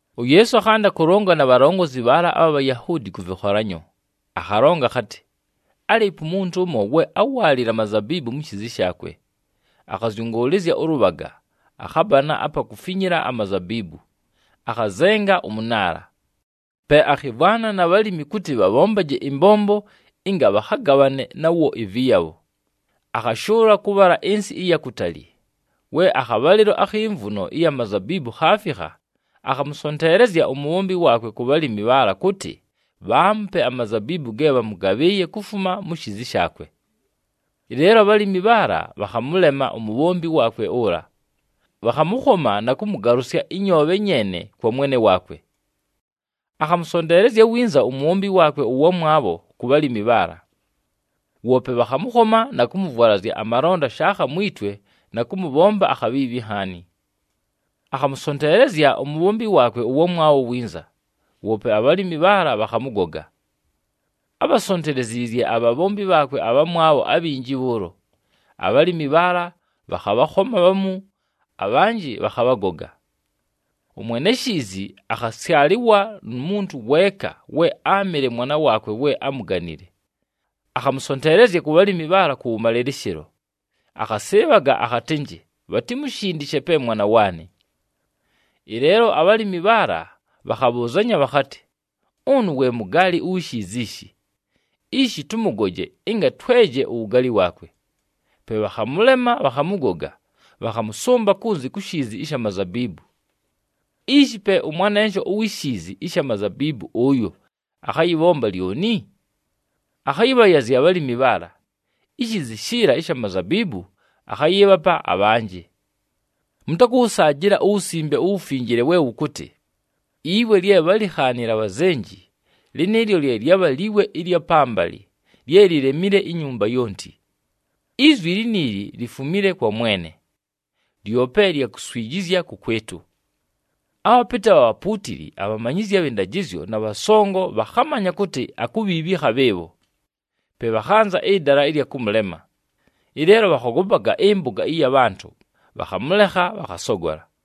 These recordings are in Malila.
UYeesu akhanda kʉlonga na bhalongozi bhaala abha Bhayahuudi kʉ vɨkholanyo. Akhalonga akhatɨ, “Álɨɨpo umuntu ʉmo, we áwaalile amazabiibu mu shiizi shaakwe. Akhazyʉngʉʉlɨzya ʉlʉbhaga, akhabana apa kufinyila amazabiibu, akhazenga ʉmʉnaala. Pe akhɨmvwana na bhalimi kʉtɨ bhabhombaje ɨmbombo ɨnga bhakhagabhane nawo ɨvɨyabho, akhashʉʉla kʉbhala ɨnsɨ ɨya kutali. We akhabhalɨlo akhi mvuno ɨya mazabiibu khaafikha, akhamʉsonteelezya umubhombi waakwe ku bhalimi bhaala, kʉtɨ bhaamupe amazabiibu ge bhamʉgabhɨɨye kufuma mu shiizi shaakwe. Ɨleelo abhalimi bhaala bhakhamʉlema umubhombi waakwe ʉla, bhakhamʉkhoma na kʉmʉgalʉsya ɨnyoobhe nyeene kwa mwene waakwe. “Akhamʉsonteelezya winza umubhombi waakwe ʉwamwabho ku bhalimi bhaala. Woope bhakhamʉkhoma na kʉmʉvwalazya amalonda shaakha mwi twe na kʉmʉbhomba akhabhiibhi nhaani. Akhamʉsonteelezya umubhombi waakwe ʉwamwabho winza, woope abhalimi bhaala bhakhamʉgoga. Ábhasonteleziizye abhabhombi bhaakwe abhamwabho abhinji bhʉʉlo. Abhalimi bhaala bhakhabhakhoma bhamu, abhanjɨ bhakhabhagoga. Ʉmwene shiizi akhasyalɨlwa nu muntu weeka we áamɨle mwana waakwe we amuganile. Akhamʉsonteelezya ku bhalimi bhaala kʉwʉmalɨlɨshɨlo, akhasɨɨbhaga akhatɨnjɨ, ‘Bhatimushindishe pe mwana waanɨ.’ “Ɨleelo abhalimi bhaala bhakhabhʉʉzanya bhakhatɨ, ‘Ʉnʉ we mugaali uwi shiizi ishi. Ishi tʉmʉgoje, ɨnga tweje uwugaali waakwe.’ Pe bhakhamʉlema, bhakhamʉgoga, bhakhamʉsʉmba kunzi ku shiizi ɨsha mazabiibu. “Ishi pe ʉmwanensho uwi shiizi ɨsha mazabiibu ʉyo akhayɨbhomba lyoni? Akhayɨbhayazya abhalimi bhaala. Ishiizi shiila ɨsha mazabiibu, akhayɨɨbhapa abhanjɨ! Mʉtakʉwʉsaajɨla uWusimbe uWufinjile we wʉkʉtɨ, ‘Iwe lye bhálikhaanile abhazenji, lɨnɨɨlyo lye lyabha liwe ɨlya pambalɨ, lye lilemile inyumba yonti. Izwi liniili lifumile kwa Mwene, lyope lya kuswijizya kʉkwɨtʉ!’” Abhapɨtɨ abha bhapuutili, abhamanyizyi abhɨ ndajɨzyo na bhasongo bhakhamanya kʉtɨ akubhiibhika bhɨɨbho. Pe bhakhanza ɨdala ɨlya kʉmʉlema, ɨleelo bhakhogopaga ɨmpʉga ɨya bhantʉ, bhakhamʉlekha, bhakhasogola.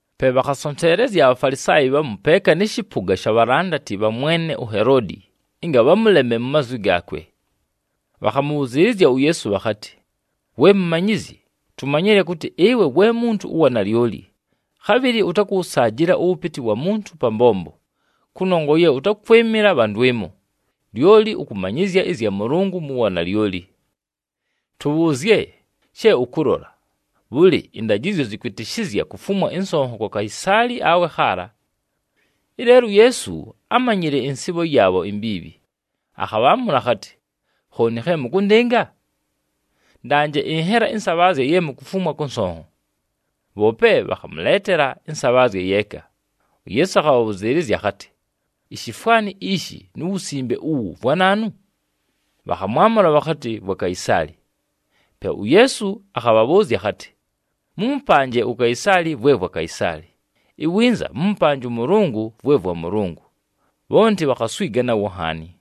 Pe bhakhasonteelezya aBhafalisaayi bhamu peeka nɨ shɨpʉga sha bhalandati bha mwene uHeloodi, ɨnga bhamʉleme mu mazwi gaakwe. Bhakhamʉbhʉzɨɨlɨzya uYeesu bhakhatɨ, “We Mumanyizyi, tumanyile kʉtɨ ɨwe we muntu ʉwa nalyoli. Khabhɨlɨ ʉtakʉwʉsaajɨla ʉwʉpɨtɨ wa muntu pa mbombo, kʉnongwa ye ʉtakwɨmɨla bha ndwɨmo, lyoli ʉkʉmanyɨzya ɨzya Mʉlʉngʉ mu wanalyoli. Tʉbhʉʉzye she ʉkʉlola. Bhʉlɨ, ɨndajɨzyo zɨkwɨtɨshɨzya kufumwa ɨnsonho kwa Kaisaali awe khaala?” Ɨleelo uYeesu ámanyile ɨnsɨɨbho yaabho imbiibhi, akhabhaamʉla akhatɨ, “Khooni khe mʉkʉndɨnga? Ndanje ɨnhela ɨnsabhaazya ye mukufumwa kʉ nsonho.” Bhoope bhakhamʉleetela ɨnsabhaazya yeeka. UYeesu akhabhabhʉzɨɨlɨzya akhatɨ, “Ishifwani ishi nu wusimbe uwu vwa naanu?” Bhakhamwamʉla bhakhatɨ, “Vwa Kaisaali.” Pe uYeesu akhabhabhʉʉzya akhatɨ, “Mʉmʉpanje uKaisaali vwe vwa Kaisaali, iwinza mʉmʉpanje ʉMʉlʉngʉ vwe vwa Mʉlʉngʉ.” Bhonti bhakhaswiga nawo nhaani.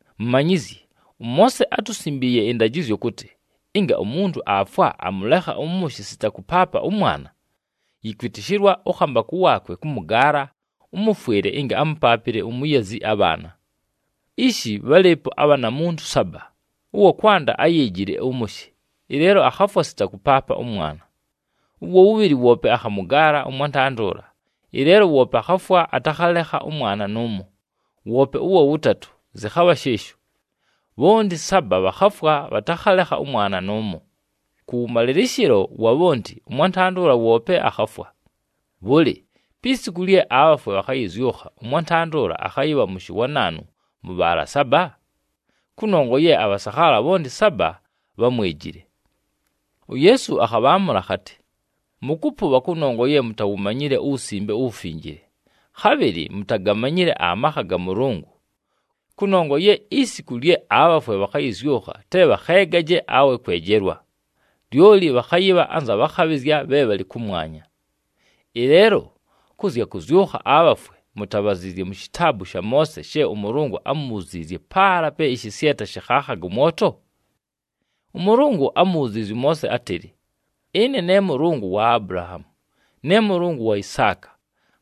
“Mumanyizyi, ʉMoose átusimbiiye ɨndajɨzyo kʉtɨ, ɨnga umuntu aafwa, amʉlekha ʉmʉshɨ sita kʉpaapa ʉmwana, yɨkwɨtɨshɨlwa ʉkhambakʉ waakwe kʉmʉgaala ʉmʉfwɨle ɨnga amʉpaapɨle umuyazi abhaana. Ishi bhálɨɨpo abhanamuntu saba. Ʉwa kwanda áyeejile ʉmʉshɨ, ɨleelo akhafwa sita kʉpaapa ʉmwana. Ʉwa wʉbhɨlɨ woope akhamʉgaala ʉmwantanda ʉla, ɨleelo woope akhafwa, atakhalekha ʉmwana nʉʉmo. Woope ʉwa wʉtatʉ zɨkhabha shɨɨsho. Bhonti saba bhakhafwa, bhatakhalekha ʉmwana nʉʉmo. Kʉwʉmalɨlɨshɨlo wa bhonti, ʉmwantanda ʉla woope akhafwa. Bhʉlɨ, pi siku lye abhafwe bhakhayɨzyʉkha, ʉmwantanda ʉla akhayɨbha mʉshɨ wa naanu mʉ bhaala saba? Kʉnongwa ye abhasakhaala bhonti saba bhámwejile!” UYeesu akhabhaamʉla akhatɨ, “Mʉkʉpʉbha kʉnongwa ye mutawumanyile uWusimbe uWufinjile, khabhɨlɨ mutagamanyile amakha ga Mʉlʉngʉ. Kʉnongwa ye isiku lye abhafwe bhakhayɨzyʉkha te bhakheegaje awe kwejelwa. Lyoli bhakhayɨbha anza bhakhabhɨzya bhe bhalɨ kʉmwanya. Ɨleelo kʉ zya kʉzyʉkha abhafwe, mutabhaziizye mu shitaabu sha Moose she ʉMʉlʉngʉ ámubhuziizye paala pe ɨshɨsyeta shɨkhaakhaga ʉmwoto? ɄMʉlʉngʉ ámubhuziizye ʉMoose átɨlɨ, ‘Ɨne ne Mʉlʉngʉ wa Abulahaamu, ne Mʉlʉngʉ wa Isaaka,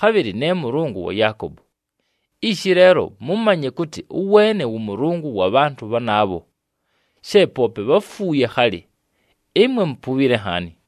khabhɨlɨ ne Mʉlʉngʉ wa Yaakobo.’ Ishi leelo mʉmanye kʉtɨ ʉweene wʉ Mʉlʉngʉ wa bhantʉ bhanaabho, she poope bháfuuye khalɨ. Ɨmwe mupubhile nhaani.”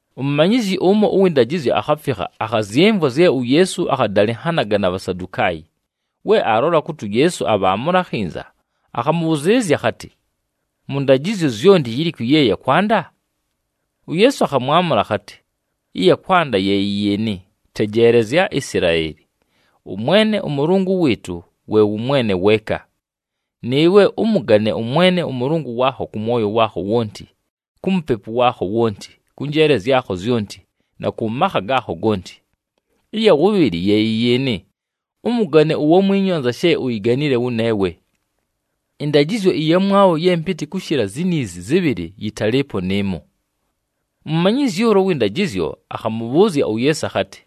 Umumanyizyi ʉmo ʉwɨ ndajɨzyo akhafikha, akhazyɨmvwa zye uYeesu akhadalɨnhanaga na Bhasadukaayi. We aalola kʉtɨ uYeesu abhaamʉla akhinza, akhamʉbhʉzɨɨlɨzya akhatɨ, “Mʉ ndajɨzyo zyonti, yilikwi ye ya kwanda?” UYeesu akhamwamʉla akhatɨ, “Ɨya kwanda ye yɨ yɨɨnɨ, ‘Tejeelezya Isilaeli! ɄMwene ʉMʉlʉngʉ wɨɨtʉ, we wʉ Mwene weeka. Nɨɨwe ʉmʉgane ʉMwene ʉMʉlʉngʉ waakho kʉ mwoyo waakho wonti, ku mupepu waakho wonti, kʉ njeele zyakho zyonti na kʉ makha gaakho gonti.’ Ɨya wʉbhɨlɨ ye yɨ yɨɨnɨ, ‘Ʉmʉgane uwamwinyu anza she uyiganile wʉneewe.’ Ɨndajɨzyo ɨyamwabho ye mpɨtɨ kʉshɨla ziniizi zɨbhɨlɨ yɨtalɨɨpo nɨɨmo.” Umumanyizyi ʉla ʉwɨ ndajɨzyo akhamʉbhʉʉzya uYeesu akhatɨ,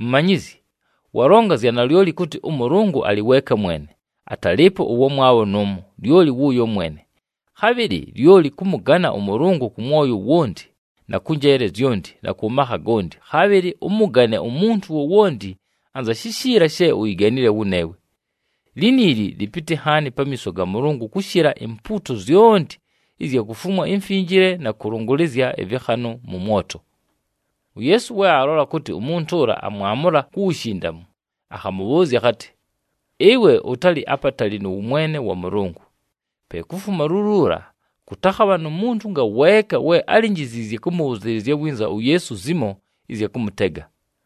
“Mumanyizyi, walonga zya nalyoli kʉtɨ ʉMʉlʉngʉ alɨ weeka mwene, atalɨɨpo ʉwamwabho nʉʉmo, lyoli wʉʉyo mwene. Khabhɨlɨ lyoli kʉmʉgana ʉMʉlʉngʉ kʉ mwoyo wonti, na kʉ njeele zyonti, na kʉ makha gonti, khabhɨlɨ ʉmʉgane umuntu wowonti anza shishiila she uyiganile wʉneewe. Liniili lɨpɨtɨ nhaani pamiiso ga Mʉlʉngʉ kʉshɨla impuuto zyonti ɨzya kufumwa imfinjile na kʉlʉngʉlɨzya ɨvɨkhanʉ mʉ mwoto.” UYeesu we aalola kʉtɨ umuntu ʉla amwamʉla ku wushindamu, akhamʉbhʉʉzya akhatɨ, “Ɨwe ʉtalɨ apatali nʉ wʉmwene wa Mʉlʉngʉ.” Pe kufuma luluula, kʉtakhabha nu muntu ngaweeka we álinjiziizye kʉmʉbhʉzɨɨlɨzya winza uYeesu zimo ɨzya kʉmʉtega.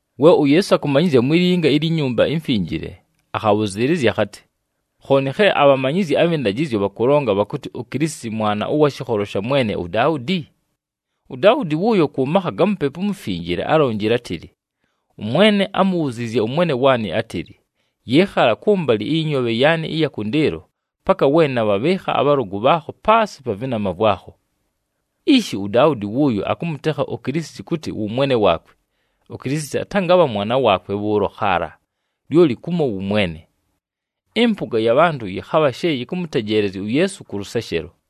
We uYeesu akʉmanyɨzya mwi linga ilyi Nyumba iMfinjile, akhabhʉzɨɨlɨzya akhatɨ, “Khooni khe abhamanyizyi abhɨ ndajɨzyo bhakʉlonga bhakʉtɨ uKilisiti Mwana ʉwa shɨkholo sha mwene uDaudi? UDaudi wʉʉyo kʉ makha ga Mupepu uMufinjile, álonjile átɨlɨ, ‘ɄMwene ámubhuziizye ʉMwene waanɨ átɨlɨ, “Yɨɨkhala kʉmbalɨ ɨyɨ nyoobhe yaanɨ ɨya kʉndɨɨlo, paka we nabhabhɨɨkha abhalʉgʉ bhaakho paasɨ pa vɨnama vwakho.”’ “Ishi uDaudi wʉʉyo akʉmʉtekha uKilisiti kʉtɨ wʉ Mwene waakwe, uKilisiti atangabha mwana waakwe bhʉʉlo khaala, lyoli kumo wʉ Mwene.” Ɨmpʉga ya bhantʉ yɨkhabha she yɨkʉmʉtejeelezya uYeesu kʉ lʉseshelo.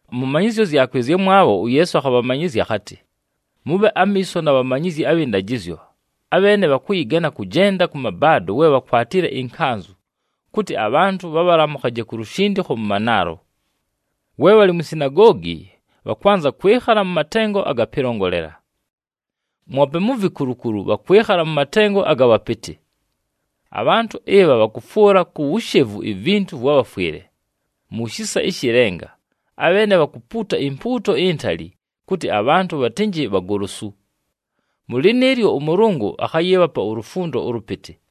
Mʉ manyɨzyo zyakwe ɨzyamwabho, uYeesu akhabhamanyɨzya akhatɨ, “Mʉbhe amiiso na bhamanyizyi abhɨ ndajɨzyo, abheene bhakʉyɨgana kʉjenda kʉ mabaado we bhakwatile ɨnkanzʉ, kʉtɨ abhantʉ bhabhalamʉkhaje ku lushindikho mʉ manaalo. We bhalɨ mwi sinagoogi, bhakwanza kwɨkhala mʉ matengo aga pɨlongolela. Mwope mu vikulukulu bhakwɨkhala mʉ matengo aga bhapɨtɨ. Abhantʉ ɨbha bhakʉfwʉla ku wushevu ivintu vwa bhafwɨle. Mu shisa ɨshɨ lenga abheene bhakupuuta impuuto intali, kʉtɨ abhantʉ bhatɨnjɨ bhagolosu. Mʉ lɨnɨɨlyo, ʉMʉlʉngʉ akhayɨɨbhapa ulufundo ʉlʉpɨtɨ!”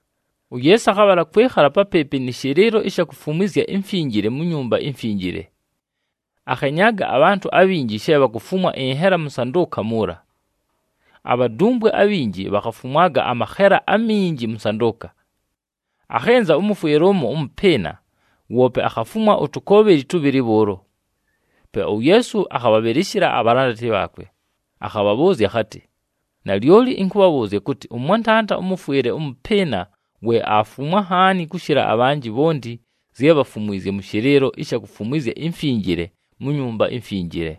UYeesu akhabhala kwɨkhala papɨɨpɨ nɨ shɨlɨɨlo ɨsha kufumwizya imfinjile mu Nyumba iMfinjile. Akhenyaaga abhantʉ abhinji she bhakufumwa ɨnhela mʉ nsandʉʉka muula. Abhadumbwe abhinji bhakhafumwaga amakhela aminji mʉ nsandʉʉka. Akhɨnza ʉmʉfwɨle ʉmo ʉmʉpɨɨna, woope akhafumwa utukoobheli tʉbhɨlɨ bhʉʉlo. Pe uYeesu akhabhabhɨlɨshɨla abhalandati bhaakwe, akhabhabhʉʉzya akhatɨ, “Nalyoli ɨnkʉbhabhʉʉzya kʉtɨ, ʉmwantanda ʉmʉfwɨle ʉmʉpɨɨna we aafumwa nhaani kʉshɨla abhanjɨ bhonti zye bhafumwizye mʉ shɨlɨɨlo ɨsha kufumwizya imfinjile, mu Nyumba iMfinjile.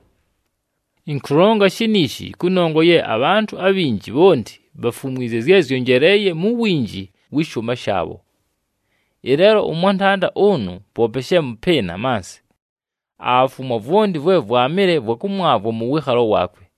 Ɨnkʉlonga shiniishi kʉnongwa ye abhantʉ abhinji bhonti bhafumwizye zye zyonjeleeye mu winji wɨ shʉʉma shaabho. Ɨleelo ʉmwantanda ʉnʉ poope she mʉpɨɨna mansɨ, aafumwa vwonti vwe vwamɨle vwa kʉmwavwa mʉ wɨɨkhalo waakwe.”